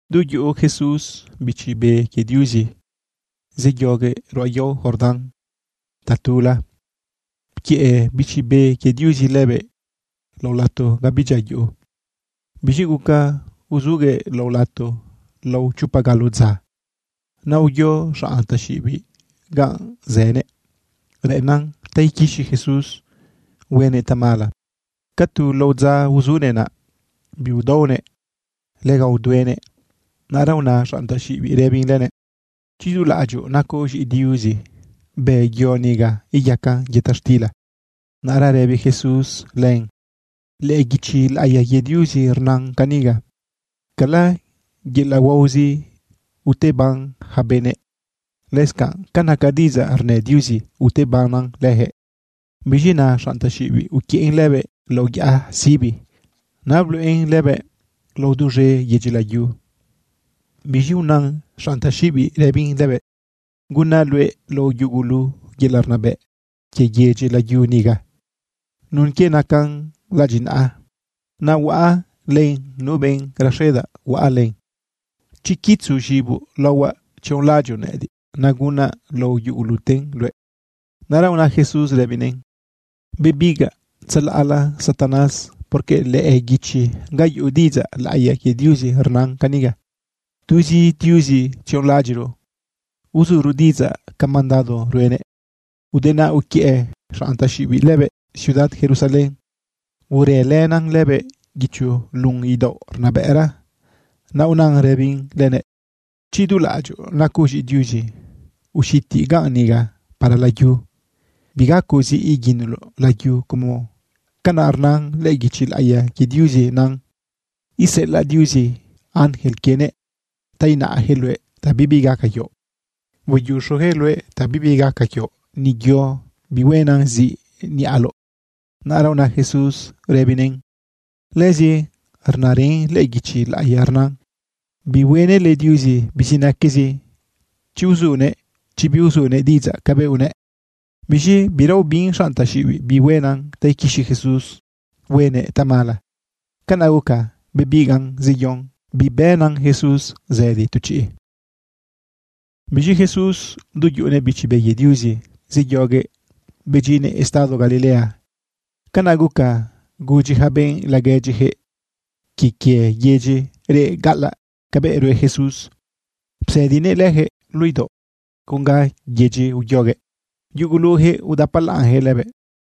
Du yuꞌu Jesús Bichi Be quie Diuzi zeyoguëꞌ ruꞌa yao Jordán tatula. Pquiëꞌ Bichi Be quie Diuzi lëbëꞌ lao lato ga bidyia yuꞌu. Biz̃i guca uzuguëꞌ lao lato lao chopa galo dza. Naꞌ uyo xanꞌ taxiꞌibiꞌ ganꞌ zënëꞌ reꞌennan ta iquixi Jesús huenëꞌ tamala. Ca tu lao dza uzunëꞌ naꞌ, biudaonëꞌ lega uduenëꞌ. Naꞌra una xanꞌ taxiꞌibiꞌ rëbin lëbëꞌ: ―Chi dulaꞌadyoꞌ nacoꞌ z̃iꞌi Diuzi, bë yo niga iyacan yëta xtila. Naꞌra rëbi Jesús len: ―Lëꞌë guichi laꞌiya quie Diuzi rnan caniga: “Cala yelaꞌ huaozi uteban yaca benëꞌ, lëscanꞌ ca naca diꞌidzaꞌ rnë Diuzi, utebannan leyaquëꞌ.” Biz̃i naꞌa, xanꞌ taxiꞌibiꞌ uquiëꞌn lëbëꞌ lao yaꞌa sibi, naꞌ bluꞌen lëbëꞌ lao duz̃e yedyi layu. Biz̃i una xanꞌ taxiꞌibiꞌ rëbin lëbëꞌ: ―Gunaꞌ luëꞌ lao yugulu yelaꞌ rnabëꞌ quie yedyi layu niga nun quie nacan ladyinaꞌa. Naꞌ huaꞌa len nu benꞌ raxedaꞌ huaꞌa len. Chi quitzo z̃iboꞌ laohuaꞌ tzionlaꞌadyoꞌ nëꞌëdiꞌ, naꞌ gunaꞌ lao yuguluten luëꞌ. Naꞌra una Jesús rëbinëꞌn: ―Bebigaꞌ tzalaꞌla, Satanás, porque lëꞌë guichi ga yuꞌu diꞌidzaꞌ laꞌiya quie Diuzi rnan caniga: “Tuzi Diuzi tzionlaꞌadyiꞌro uzuro diꞌidzaꞌ ca mandado ruenëꞌ.” Ude naꞌ uquiëꞌ xanꞌ taxiꞌibiꞌ lëbëꞌ ciudad Jerusalén, urëlëna lëbëꞌ guicho lun idaoꞌ rnabëꞌra. Naꞌ unan rëbin lëbëꞌ: ―Chi dulaꞌadyoꞌ nacoꞌ z̃iꞌi Diuzi, uxiti ganꞌ niga para layu. Bigacoꞌ ziꞌ iguinoloꞌ layu como canaꞌ rnan lëꞌë guichi laꞌiya quie Diuzi nan: Iseꞌelaꞌ Diuzi ángel quienëꞌ ta inaꞌyaquëꞌ luëꞌ ta bibi gaca quioꞌ. Hueyuxuyaquëꞌ luëꞌ ta bibi gaca quioꞌ, ni yo bihuenan ziꞌ niꞌaloꞌ. Naꞌra una Jesús rëbinëꞌn: ―Lëzi rnarën lëꞌë guichi laꞌiya rnan: “Bihuenële Diuzi bizinaquezi chi uzunëꞌ, chi biuzunëꞌ diꞌidzaꞌ cabëꞌ unëꞌ.” Biz̃i bira ubin xanꞌ taxiꞌibiꞌ bihuena ta iquixi Jesús huenëꞌ tamala, canaꞌ guca bebigaꞌn zeyon bibënan Jesús zëdi tu chiꞌ. Biz̃i Jesús, du yuꞌunëꞌ Bichi Be quie Diuzi, zeyoguëꞌ bedyinnëꞌ estado Galilea. Canaꞌ guca gudyi yaca benꞌ laguedyiyaquëꞌ quie quie yedyi reꞌ gaꞌalaꞌ cabëꞌ rue Jesús. Psëdinëꞌ leyaquëꞌ luꞌu idaoꞌ con ga yedyi uyoguëꞌ. Yuguluyaquëꞌ udapalaꞌnjëꞌ lëbëꞌ.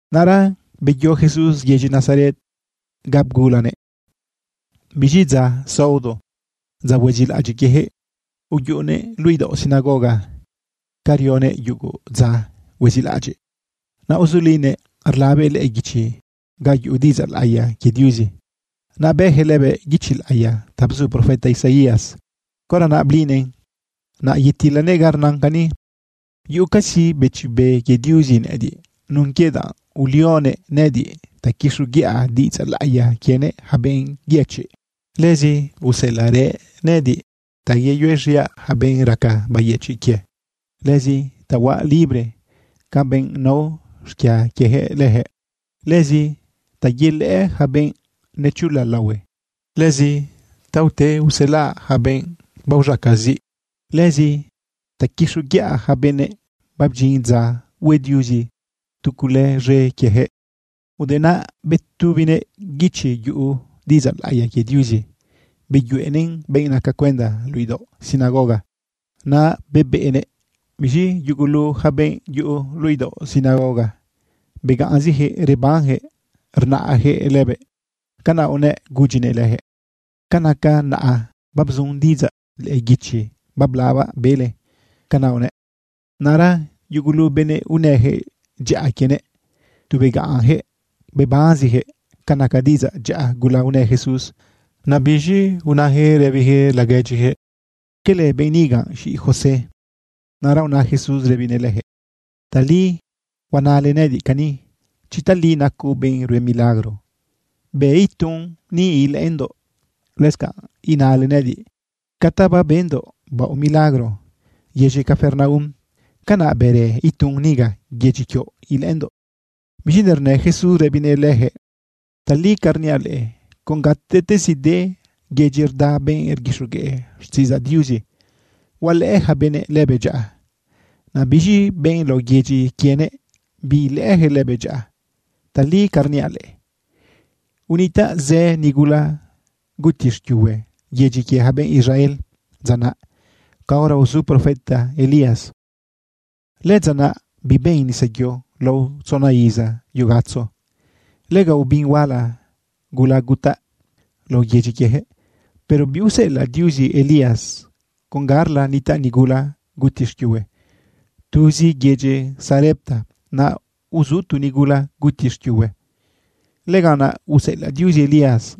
Naꞌra beyo Jesús yedyi Nazaret ga bgulanëꞌ. Biz̃i dza saodo, dza huezilaꞌadyiꞌ quieyaquëꞌ, uyuꞌunëꞌ luꞌu idaoꞌ sinagoga ca rionëꞌ yugu dza huezilaꞌadyiꞌ. Naꞌ uzulinëꞌ rlabëꞌ lëꞌë guichi ga yuꞌu diꞌidzaꞌ laꞌiya quie Diuzi. Naꞌ bëꞌyaquëꞌ lëbëꞌ guichi laꞌiya ta bzu profeta Isaías. Caora blinëꞌn, naꞌ yetilëꞌ ga rnan cani: Yuꞌucazi Bichi Be quie Diuzi nëꞌëdiꞌ nun quie danꞌ ulionëꞌ nëꞌëdiꞌ ta quixoguiꞌa diꞌidzaꞌ laꞌiya quienëꞌ yaca benꞌ yëchiꞌ. Lëzi useꞌelaꞌrëꞌ nëꞌëdiꞌ ta yeyuez̃iaꞌ yaca benꞌ raca bayëchiꞌ quie, lëzi ta huaꞌ libre ca benꞌ nao xquia quieyaquëꞌ leyaquëꞌ, lëzi ta yelëꞌë yaca benꞌ nechula laohue, lëzi ta ute uselaꞌ yaca benꞌ baoz̃aca ziꞌ, lëzi ta quixoguiꞌa yaca benëꞌ babdyin dza hue Diuzi tu cule z̃e quieyaquëꞌ. Ude naꞌ betubinëꞌ guichi yuꞌu diꞌidzaꞌ laꞌiya quie Diuzi, beyuꞌenëꞌn benꞌ naca cuenda luꞌu idaoꞌ sinagoga, naꞌ bebeꞌnëꞌ. Biz̃i yugulu yaca benꞌ yuꞌu luꞌu idaoꞌ sinagoga, begaꞌnziyaquëꞌ rebanyaquëꞌ rnaꞌyaquëꞌ lëbëꞌ. Canaꞌ unëꞌ gudyinëꞌ leyaquëꞌ: ―Ca naca naꞌa, babzun diꞌidzaꞌ lëꞌë guichi bablabaꞌ bele. ―Canaꞌ unëꞌ. Naꞌra yugulu benëꞌ unëyaquëꞌ dyaꞌa quienëꞌ, tu begaꞌnyaquëꞌ bebanziyaquëꞌ ca naca diꞌidzaꞌ dyaꞌa gula unë Jesús. Naꞌ biz̃i unayaquëꞌ rëbiyaquëꞌ laguedyiyaquëꞌ: ―¿Cala biꞌ niga z̃iꞌi José? Naꞌra una Jesús rëbinëꞌ leyaquëꞌ: ―Tali huanale nëꞌëdiꞌ cani: “Chi tali nacoꞌ benꞌ rue milagro, bë itun ni ilëꞌëndoꞌ.” Lëscanꞌ inale nëꞌëdiꞌ: “Ca ta babendoꞌ baoꞌ milagro yedyi Capernaum, canaꞌ bërë itun niga yedyi quioꞌ ilëꞌëndoꞌ.” Biz̃i nernë Jesús rëbinëꞌ leyaquëꞌ: ―Tali ca rniaꞌ leꞌe, con gatezi de yedyi rda benꞌ rguixogueꞌ xtiꞌidzaꞌ Diuzi, hualëꞌë yaca benëꞌ lëbëꞌ dyaꞌa. Naꞌ biz̃i benꞌ lao yedyi quienëꞌ biilëꞌëyaquëꞌ lëbëꞌ dyaꞌa. Tali ca rniaꞌ leꞌe, unitaꞌ zë nigula guti xquiuhue yedyi quie yaca benꞌ Israel dza naꞌ caora uzu profeta Elías. Lëdza naꞌ biben nisayo lao tzona iza yugatzo. Lega ubin huala gula gutaꞌ lao yedyi quiejëꞌ. Pero biuseꞌelaꞌ Diuzi Elías con garla nitaꞌ nigula guti xquiuhue. Tuzi yedyi Sarepta, naꞌ uzu tu nigula guti xquiuhue, lëganꞌ naꞌ useꞌelaꞌ Diuzi Elías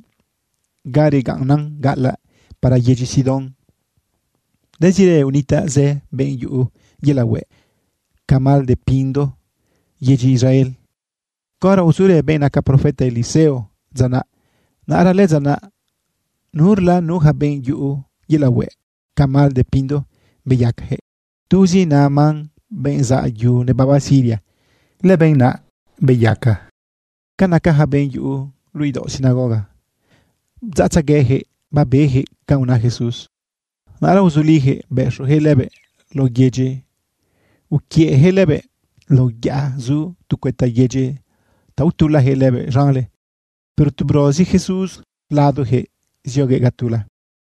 ga regaꞌnnan gaꞌalaꞌ para yedyi Sidón. Lëzirë unitaꞌ zë benꞌ yuꞌu yelaꞌ hueꞌ ca mal de pindo yedyi Israel caora uzurë benꞌ naca profeta Eliseo dza naꞌ. Naꞌra lëdza naꞌ nurla nuyaca benꞌ yuꞌu yelaꞌ hueꞌ ca mal de pindo beyaca. Tuzi Naamán, benꞌ zaꞌ yu nebaba Siria, lëbenꞌ naꞌ beyaca. Ca naca yaca benꞌ yuꞌu luꞌu idaoꞌ sinagoga, bdzaꞌtzegueyaquëꞌ babeyaquëꞌ canꞌ una Jesús. Naꞌra uzuliyaquëꞌ bëxoyaquëꞌ lëbëꞌ lao yedyi uquiëꞌyaquëꞌ lëbëꞌ lao yaꞌa zu cuëta yedyi ta utulayaquëꞌ lëbëꞌ z̃anle. Pero tu brozi Jesús ladoyaquëꞌ zioguëꞌ ga tula.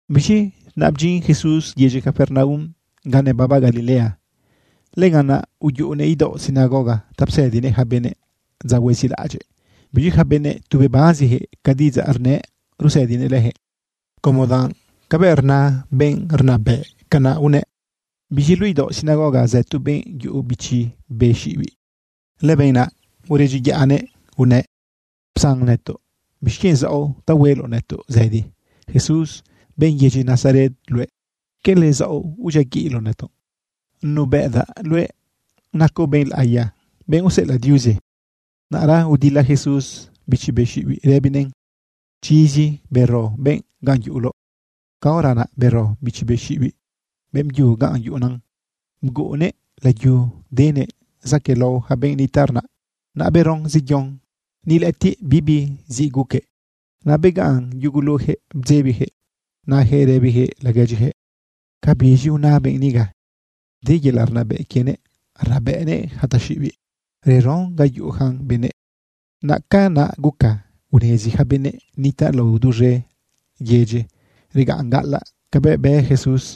Biz̃i naꞌ bdyin Jesús yedyi Capernaum ga nebaba Galilea. Lëganꞌ naꞌ uyuꞌunëꞌ idaoꞌ sinagoga ta psëdinëꞌ yaca benëꞌ dza huezilaꞌadyiꞌ. Biz̃i yaca benëꞌ tu bebanziyaquëꞌ ca diꞌidzaꞌ rnëꞌ rusëdinëꞌ leyaquëꞌ como danꞌ cabëꞌ rna benꞌ rnabëꞌ, canaꞌ unëꞌ. Biz̃i luꞌu idaoꞌ sinagoga zë tu benꞌ yuꞌu bichi be xiꞌibiꞌ. Lëbenꞌ naꞌ uredyiyaꞌnëꞌ unëꞌ: ―Psan nëtoꞌ. ¿Bixquienꞌ zaoꞌ ta hueloꞌ nëtoꞌ zëdi? Jesús benꞌ yedyi Nazaret luëꞌ. ¿Cala zaoꞌ udyiaguiꞌloꞌ nëtoꞌ? Nubëꞌdaꞌ luëꞌ nacoꞌ benꞌ laꞌiya, benꞌ useꞌelaꞌ Diuzi. Naꞌra udila Jesús bichi be xiꞌibiꞌ rëbinëꞌn: ―¡Chizi, bero benꞌ naꞌ ganꞌ yuꞌuloꞌ! Caora naꞌ bero bichi be xiꞌibiꞌ beꞌmbyu ganꞌ yuꞌuna, bguꞌunnëꞌ layu, denëꞌ zaquëꞌlao yaca benꞌ nitaꞌ rnaꞌ. Naꞌ beron zeyon, ni lëꞌëtiꞌ bibi ziꞌ guquëꞌ. Naꞌ begaꞌn yuguluyaquëꞌ bdzebiyaquëꞌ nayaquëꞌ rëbiyaquëꞌ laguedyiyaquëꞌ: ―¿Cabiz̃i una benꞌ niga? De yelaꞌ rnabëꞌ quienëꞌ rnabëꞌnëꞌ yaca taxiꞌibiꞌ reron ga yuꞌuyacan benëꞌ. Naꞌ canaꞌ guca unezi yaca benëꞌ nitaꞌ lao duz̃e yedyi regaꞌn gaꞌalaꞌ cabëꞌ bë Jesús.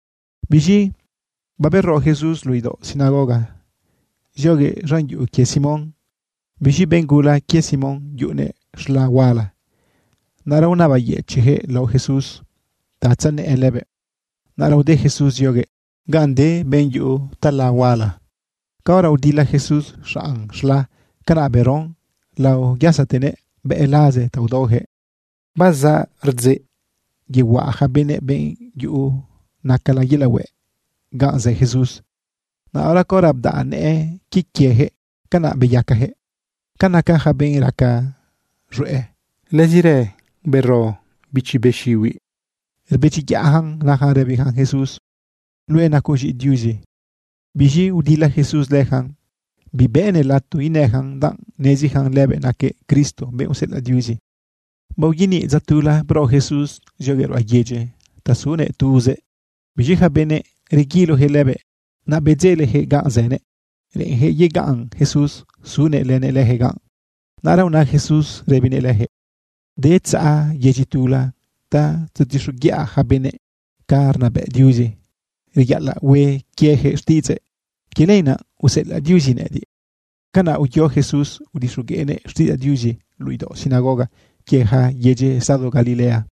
Biz̃i babero Jesús luꞌu idaoꞌ sinagoga zioguëꞌ z̃an yuꞌu quie Simón. Biz̃i benꞌ gula quie Simón yuꞌunëꞌ z̃la huala. Naꞌra unabayëchiꞌyaquëꞌ lao Jesús ta tzanëꞌë lëbëꞌ. Naꞌra ude Jesús zionëꞌ ganꞌ de benꞌ yuꞌu tala huala. Caora udila Jesús xanꞌ z̃la, canaꞌ beron, laoyasatenëꞌ bëꞌ laze ta udaoyaquëꞌ. Bazaꞌ rdzeꞌ yehuaꞌa yaca benëꞌ benꞌ yuꞌu nacala yelaꞌ hueꞌ ganꞌ zë Jesús. Naꞌra caora bdaꞌ nëꞌë quie quieyaquëꞌ, canaꞌ beyacayaquëꞌ. Ca naca yaca benꞌ raca z̃hueꞌ, lëzirë bero bichi be xiꞌibiꞌ rbedyiyaꞌyacan nayacan rëbiyacan Jesús: ―Luëꞌ nacoꞌ z̃iꞌi Diuzi. Biz̃i udila Jesús leyacan bibëꞌnëꞌ lato inëyacan danꞌ neziyacan lëbëꞌ naquëꞌ Cristo, benꞌ useꞌelaꞌ Diuzi. Baoyaniꞌ dza tula, bro Jesús zioguëꞌ ruꞌa yedyila ta sunëꞌ tuzëꞌ. Biz̃i yaca benëꞌ reguiloyaquëꞌ lëbëꞌ naꞌ bedzeleyaquëꞌ ganꞌ zënëꞌ. Reꞌenyaquëꞌ yegaꞌn Jesús sunëꞌ lënëꞌ leyaquëꞌ ganꞌ. Naꞌra una Jesús rëbinëꞌ leyaquëꞌ: ―De tzaꞌa yedyi tula ta tzetixoguiꞌa yaca benëꞌ ca rnabëꞌ Diuzi reyaꞌalaꞌ hue quieyaquëꞌ xtiꞌidzëꞌ. Quie lenaꞌ useꞌelaꞌ Diuzi nëꞌëdiꞌ. Canaꞌ uyo Jesús udixogueꞌnëꞌ xtiꞌidzaꞌ Diuzi luꞌu idaoꞌ sinagoga quie yaca yedyi estado Galilea.